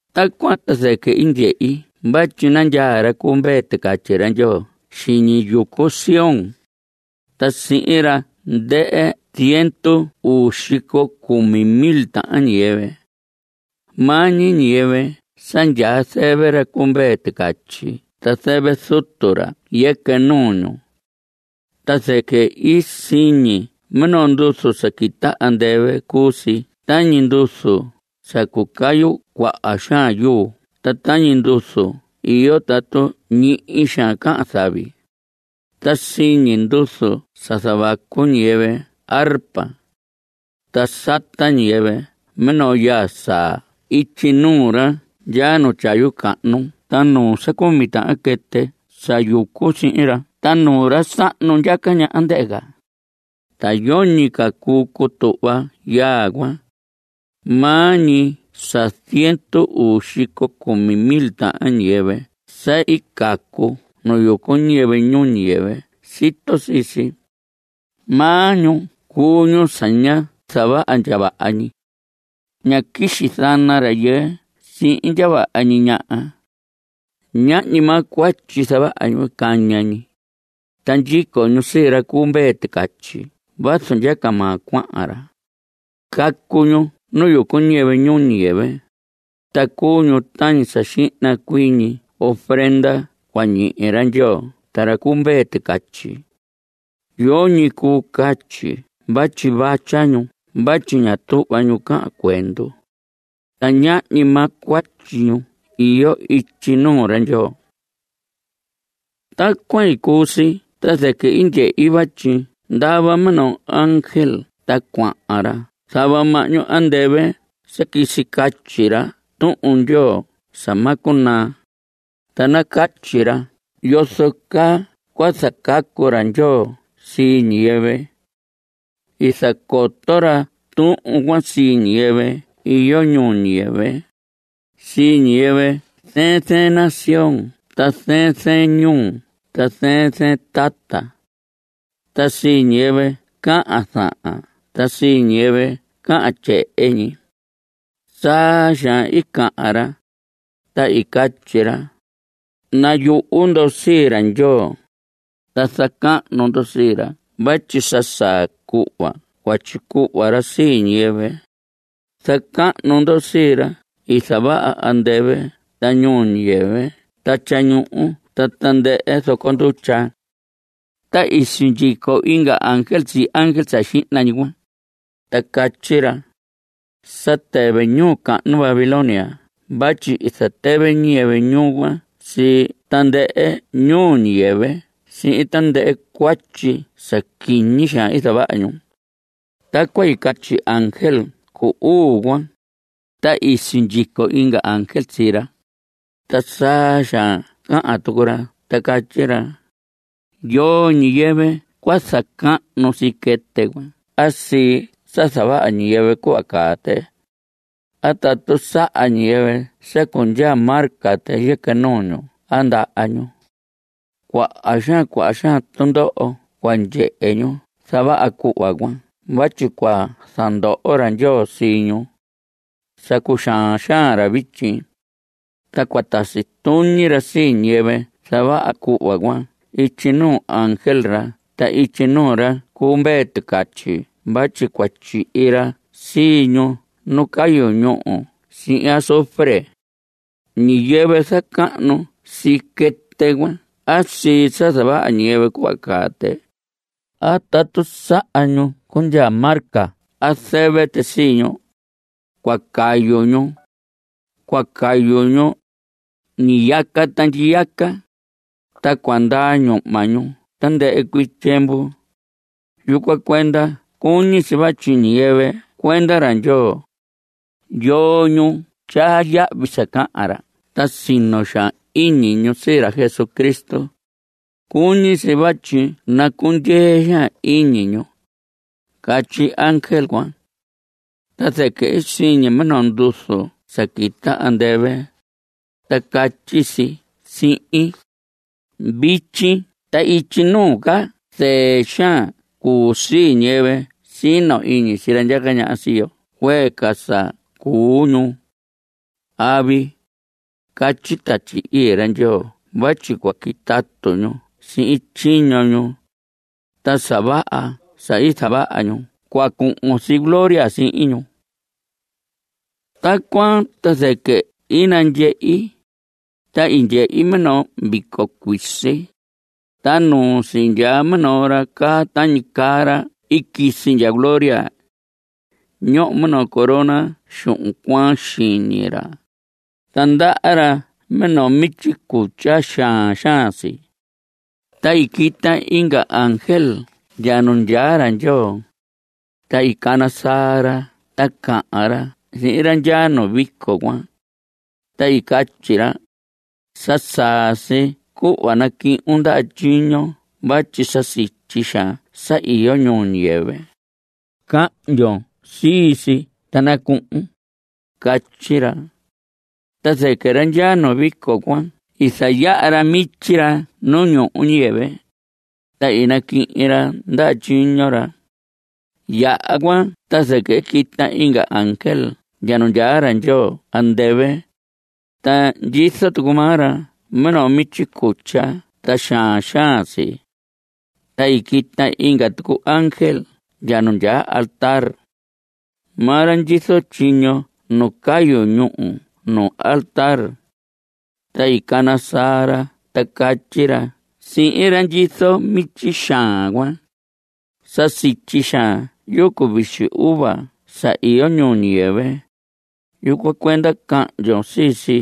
Tacuan ta zɨquɨ i ndyehi vatyi nandyaa ra cu Mvee Ticatyi ra Ndyoo xiñi yucu Sión. Ta sihin ra ndɨhɨ ziendu uu xico cumi mil tahan ñiyɨvɨ. Maa ñi ñiyɨvɨ sa ndyaa zɨvɨ ra cu Mvee Ticatyi ta zɨvɨ Zutu ra yɨquɨ nuu ñu. Ta zɨquɨ i siñi minoo nduzu sa quita andɨvɨ. Cuu si tañi nduzu sa cucayu cuaha xaan yuu ta tañi nduzu iyo tatu ñihi xaan cahan zavi. Ta siñi nduzu sa zavacu ñiyɨvɨ arpa. Ta sata ñiyɨvɨ minoo yaa saa ityi nuu ra ndyaa nu tyayu cahnu ta nuu sa cumi tahan quɨtɨ sa yucu sihin ra ta nuu ra sahnu ndyaca ñaha, ndɨhɨ ca. Ta yoñi ca cuu cutuhva yaa cuan, maa ñi sa ziendu uu xico cumi mil tahan ñiyɨvɨ sa i cacu nu yucu ñiyɨvɨ ñuu ñiyɨvɨ sito sii si. Maa ñu cuu ñu sa ñá zavaha ndya vaha ñi. Ñá quixi zana rayɨɨ sihin ndya vaha ñi ñaha. Ñahñi maa cuatyi zavaha ñu caña ñi. Ta ndyico ñu sii ra cu Mvee Ticatyi vazu ndyaca maa cuahan ra. Cacu ñu nu yucu ñiyɨvɨ ñuu ñiyɨvɨ, ta cuu ñu tañi sa xihna cuii ñi ofrenda cua ñihi ra Ndyoo ta ra cu Mvee Ticatyi. Yoñi cuu catyi vatyi vatya ñu vatyi ña tuhva ñu cahan cuendu. Ta ñahñi maa cuatyi ñu iyo ityi nuu ra Ndyoo. Tacuan i cuu si ta zɨquɨ i ndyehi vatyi ndava minoo ángel ta cuahan ra zava mahñu andɨvɨ sa quisi catyi ra Tuhun Ndyoo sa ma cunaa, ta nacatyi ra yozo caa cua zacacu ra Ndyoo sii ñiyɨvɨ. I zacoto ra tuhun cuan sii ñiyɨvɨ iyo ñuu ñiyɨvɨ, sii ñiyɨvɨ zɨɨn zɨɨn nación ta zɨɨn zɨɨn ñuu ta zɨɨn zɨɨn tata. Ta sii ñiyɨvɨ cahan zahan ta sii ñiyɨvɨ cahan tyehen ñi. Saa xaan i cahan ra, ta i catyi ra: Nayuhu ndo sii ra Ndyoo, ta zacahnu ndo sii ra vatyi sa saa cuhva cua tyicuhva ra sii ñiyɨvɨ. Zacahnu ndo sii ra i zavaha andɨvɨ ta ñuu ñiyɨvɨ ta tyañuhu ta tandɨhɨ zoco ndutya. Ta i sindyico inga ángel sii ángel sa xihna ñi cuan, ta catyi ra: Sa tɨvɨ ñuu cahnu Babilonia vatyi i zatɨvɨ ñiyɨvɨ ñuu cuan sii tandɨhɨ ñuu ñiyɨvɨ sihin tandɨhɨ cuatyi sa quiñi xaan i zavaha ñu. Tacuan i catyi ángel cu uu cuan, ta i sindyico inga ángel sii ra, ta saa xaan cahan tucu ra ta catyi ra: Yoo ñiyɨvɨ cua zacahnu sii quɨtɨ cuan a sii sa zavaha ñiyɨvɨ cuhva caa tɨ, a tatu saha ñiyɨvɨ sa cundyaa marca tɨ yɨquɨ nuu ñu a ndaha ñu. Cuaha xaan cuaha xaan tundoho cua ndyehe ñu zavaha cuhva cuan vatyi cua zandoho ra Ndyoo sii ñu. Sa cuxaan xaan ra vityi, ta cua tasi tuñi ra sii ñiyɨvɨ zavaha cuhva cuan ityi nuu ángel ra ta ityi nuu ra cu Mvee Ticatyi vatyi cua tyihi ra sii ñu nu cayu ñúhu sihin azufre. Ñiyɨvɨ zacahnu sii quɨtɨ cuan a sii sa zavaha ñiyɨvɨ cuhva caa tɨ, a tatu saha ñu cundyaa marca a zɨvɨ tɨ sii ñu, cua cayu ñu. Cua cayu ñu ñiyaca ta ndyiyaca, ta cua ndaa ñuhma ñu tandɨhɨ cuii tyiemvu. Yucuan cuenda cuñi si vatyi ñiyɨvɨ cuenda ra Ndyoo, yoo ñu tyaa yahvi sa cahan ra ta sino xaan iñi ñu sii ra Jesucristo, cuñi si vatyi nacundyee xaan iñi ñu. Catyi ángel cuan. Ta zɨquɨ i siñi minoo nduzu sa quita andɨvɨ, ta catyi si sihin: “Vityi ta ityi nuu ca zɨɨ xaan cuu sii ñiyɨvɨ sino iñi sii ra ndyaca ñaha sii yo cuee ca sa cuu ñu. Avi, catyi Tatyi Ii ra Ndyoo vatyi cua quitatu ñu sihin tyiño ñu, ta sa vaha sa i zavaha ñu cua cuhun si gloria sihin ñu.” Tacuan ta zɨquɨ i nandyehi, ta i ndyehi minoo vico cuisi, ta nuu si ndyaa minoo ra caa tañi caa ra i quisi ndya gloria. Ñoho minoo corona xuhun cuaan xiñi ra, ta ndaha ra minoo mityi cutya, xaan xaan si. Ta i quita inga ángel ndya nu ndyaa ra Ndyoo, ta i cana saa ra ta cahan ra sihin ra ndyaa nu vico cuan, ta i catyi ra: Sa saa si cuhva nacuhun ndaha tyiñon vatyi sa sityi xaan sa iyo ñuu ñiyɨvɨ. Cahndyon sii si ta nacuhun. Catyi ra. Ta zɨquɨ ra ndyaa nu vico cuan i zayaha ra mityi ra nuu ñuu ñiyɨvɨ, ta i naquihin ra ndaha tyiño ra. Yaha cuan ta zɨquɨ i quita inga ángel ndya nu ndyaa ra Ndyoo andɨvɨ, ta ndyizo tucu maa ra minoo mityi cutya ta xaan xaan si. Ta i quita inga tucu ángel ndya nu ndyaa altar. Maa ra ndyizo tyiño nu cayu ñúhu nu altar. Ta i cana saa ra ta catyi ra sihin ra ndyizo mityi xaan cuan: Sa sityi xaan yucu vixi uva sa iyo ñuu ñiyɨvɨ. Yucuan cuenda cahndyon sii si.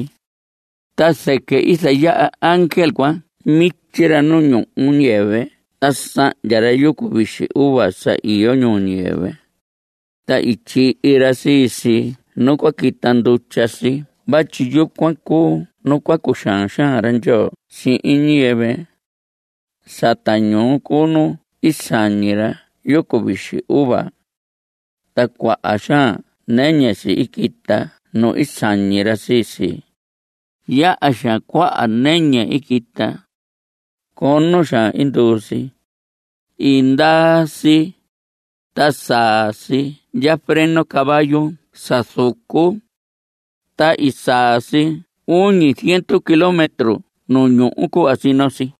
Ta zɨquɨ i zayaha ángel cuan mityi ra nu ñuu ñiyɨvɨ ta sahndya ra yucu vixi uva sa iyo ñuu ñiyɨvɨ, ta i tyihi ra sii si nu cua quita ndutya si vatyi yucuan cuu nu cua cuxaan xaan ra Ndyoo sihin ñiyɨvɨ. Sata ñuu cuu nu i sañi ra yucu vixi uva cuan. Ta cuaha xaan nɨñɨ si i quita nu i sañi ra sii si. Yaha xaan cuaha nɨñɨ i quita. Cono xaan i nduu si. I ndaa si, ta saa si ndya freno caballo sa zucu. Ta i saa si uñi ziendu kilómetro nu ñuhu cuhva i sino si.